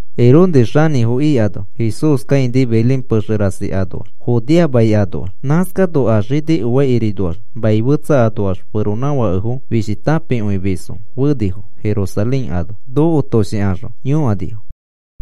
Herodes xanĩfo ikano Jesús kãini Belén pexe rasi anoax, Judea mai anoax. Nãskano a xini oaikirinoax mai fetsa anoax feronãfakefo fishi tãpikõimisfo fenifo Jerusalén ano. Nokotoshikaxõ yõkanifo: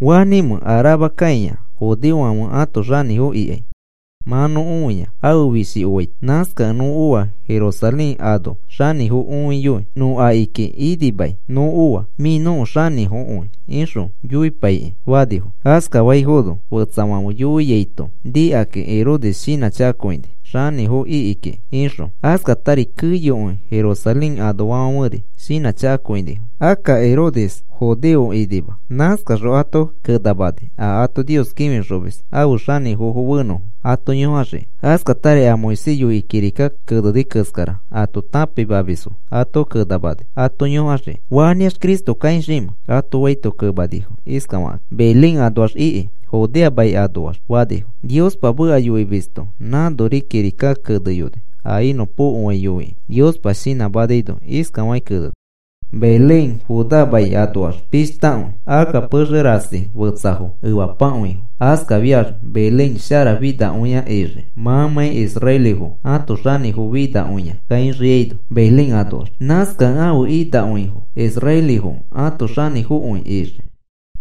“¿Fanĩmẽ a rama kãia judeofãfe ãto xanĩfo ikai? Mã nõ õia ãfe fishi oaito. Nãskakẽ nõ oa Jerusalén ano xanĩfo õiyoi. Nõ akiki inimai nõ oa, ‘Mĩ nõko xanĩfokõi,’ ixõ yoipaikĩ,” fanifo. Askafaifono fetsafãfe yoiaito nikakĩ Herodes shinãchakakõini xanĩfo iki kiki ixõ. Askatari keyokõi Jerusalén anoafãferi shinãchakakõinifo. Akka Herodes judeo inima. Nãskaxõ ato kenamani a ato Nios kĩfixomis ãfe xanĩfofo fenõfo ato yõkaxiki. Askatari a Moisés yoikĩ kirika keneni keskara ato tãpimamisfo ato kenamani ato yõkaxiki. “¿Fanĩax Cristo kãixiimẽ?” ato faito kemanifo iskafakakĩ: “Belén anoax iki, Judea mai anoax,” fanifo. “Niospa meka yoimisto nãnori kirika keneyoni a inõpokoai yoikĩ Niospa shinãmanaino. Iskafakĩ keneni: Belén, Judá mai anoax pishtakõi. Akka pexe rasi fetsafo efapakõifo. Askafiax Belén sharafinakõia ixii mãmãi israelifo ãto xanĩfo finakõia kãixiaino Belén anoax. Nãskakẽ ãfe inakõifo israelifo ãto xanĩfokõi ixii,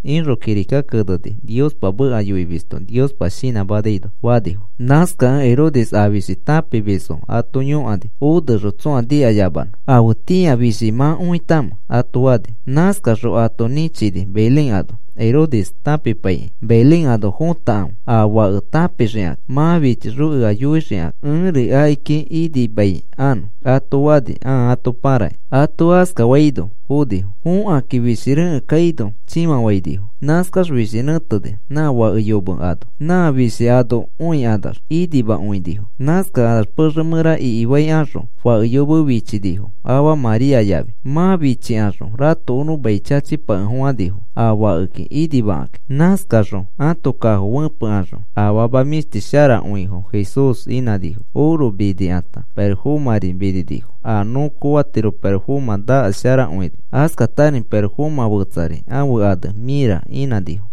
ixõ kirikaki keneni Niospa meka yoimisto Niospa shinãmanaino,” fanifo. Nãskakẽ Herodes a fishi tãpimisfo ato yõkani onexõ tsõa nikayamanõ: “¿Afetĩa fishi mã õitamẽ?” ato fani. Nãskaxõ ato nĩchini Belén ano. Herodes tãpipaikĩ, “Belén ano fotakãfe a fake tãpixikakĩ. Mã fichixõ ea yoifexikakĩ ẽri akiki inimaikanõ,” ato fani ãa ato pãrakĩ. Ato askafaino fonifo. Fokakĩ fishi rekẽ kaino chĩfafainifo. Nãskax fishi nẽteni nã fake yome ano. Nã fishi anã õikanax inimakõinifo. Nãskakanax pexe mẽra ikifaikaxõ fake yome fichinifo afa María yafi. Mã fichikaxõ ratokonõ mai chachipakefofãnifo, a fakeki inimakakĩ. Nãskakaxõ ãto kafo fẽpekaxõ afama mĩshti sharakõifo Jesús inãnifo. Oro minikãta, pirofomãri mininifo a nõ koofatiro pirofomã nakas sharakõi. Askatari pirofomã fetsari ãfe ane mĩra inãnifo.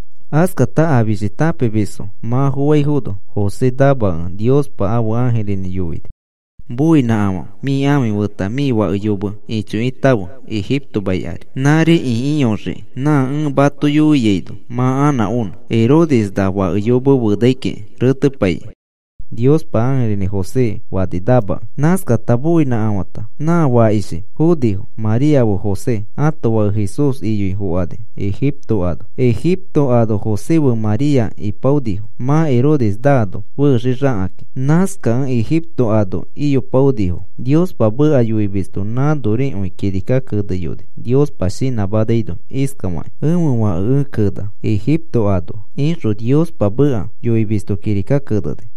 Askata a fishi tãpimisfo mã foaifono, José namakẽ, Niospa ãfe ãjirinĩ yoini: “Moinãkafafe. Mĩ ãfi feta mĩ fake yome ichokitãfe Egipto mai ari. Nãri ikiyoxiki nã ẽ mato yoiaino mã anã onõ. Herodes na fake yome fenai kiki retepaikĩ,” Niospa ãjirinĩ José fani namakẽ. Nãskata moinãkafata, nã fakishi fonifo María fe José ãto fake Jesús iyoi fokani Egipto ano. Egipto ano José fe María ipaonifo mã Herodes naano fexixakakĩ. Nãskakẽ Egipto ano iyopaonifo. Niospa meka yoimisto nãnorikõi kirika keneyoni Niospa shinãmanaino iskafakĩ: “Ẽfe fake ẽ kena Egipto anoa,” ixõ Niospa meka yoimisto kirika keneni.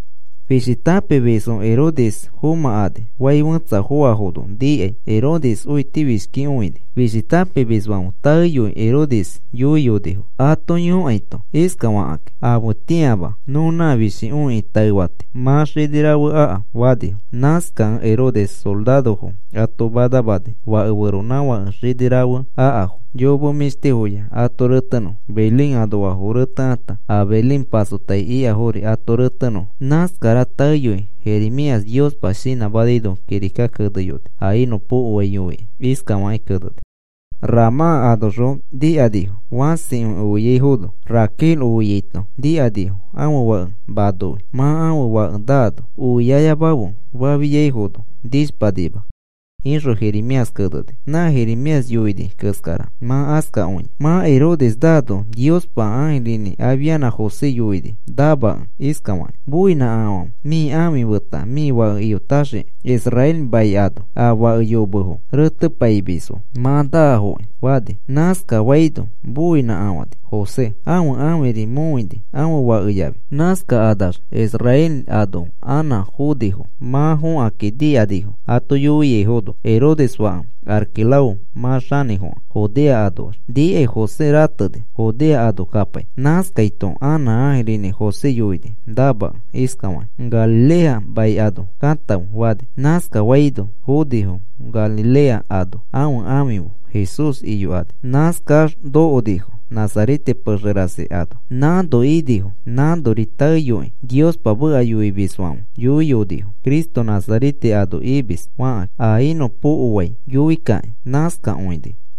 Fishi tãpimisfo Herodes fomãkani. Fai fẽtsa foafono nikai, Herodes õitifishkikõini. Fishi tãpimisfãfe taeyoi Herodes yoiyonifo ato yõkaito iskafakakĩ: “Afetĩama nõ nã fishi õikĩ taefati, mã xini rafe aka,” fanifo. Nãskakẽ Herodes sorarofo ato manamani fake feronãfake xini rafe akafo, yome mĩshtifoya ato retenõfo, Belén anoafo retekãta, a Belén pasotai ikafori ato retenõfo. Nãskara taeyoi Jeremías Niospa shinãmanaino kirika keneyoni a inõpokoai yoikĩ. Iskafakĩ keneni: Ramã anoxõ nikanifo fãsikõi oiaifono. Raquel oiaito nikanifo ãfe fake manoi, mã ãfe fake nano. Oiyayamafe fafiaifono nishpanima, ixõ Jeremías keneni. Nã Jeremías yoini keskara mã askakõia. Mã Herodes naano Niospa ãjirinĩ afianã José yoini namakẽ iskafakĩ: “Moinãkafafe. Mĩ ãfi feta mĩ fake iyotaxiki Israel mai ano. A fake yomefo retepaimisfo mã naafoki,” fani. Nãskafaino moinãkafani José. Ãfe ãfiri mõini ãfe fake yafi. Nãskakanax Israel ano anã fonifo. Mã fõkakĩ nikanifo ato yoiaifono Herodes fake Arquelao mã xanĩfokẽ Judea anoax. Nikai José rateni Judea ano kapai. Nãskaito anã ãjirinĩ José yoini namakẽ iskafakĩ: “Galilea mai ano katãfe,” fani. Nãskafaino fonifo Galilea ano ãfe ãfi fe Jesús iyokani. Nãskax nokonifo Nazarete pexe rasi ano. Nãno inifo. Nãnori taeyoikõi Niospa meka yoimisfãfe yoiyonifo, “Cristo Nazarete ano imis,” fakakĩ, a inõpokoai yoikakĩ. Nãskakõini.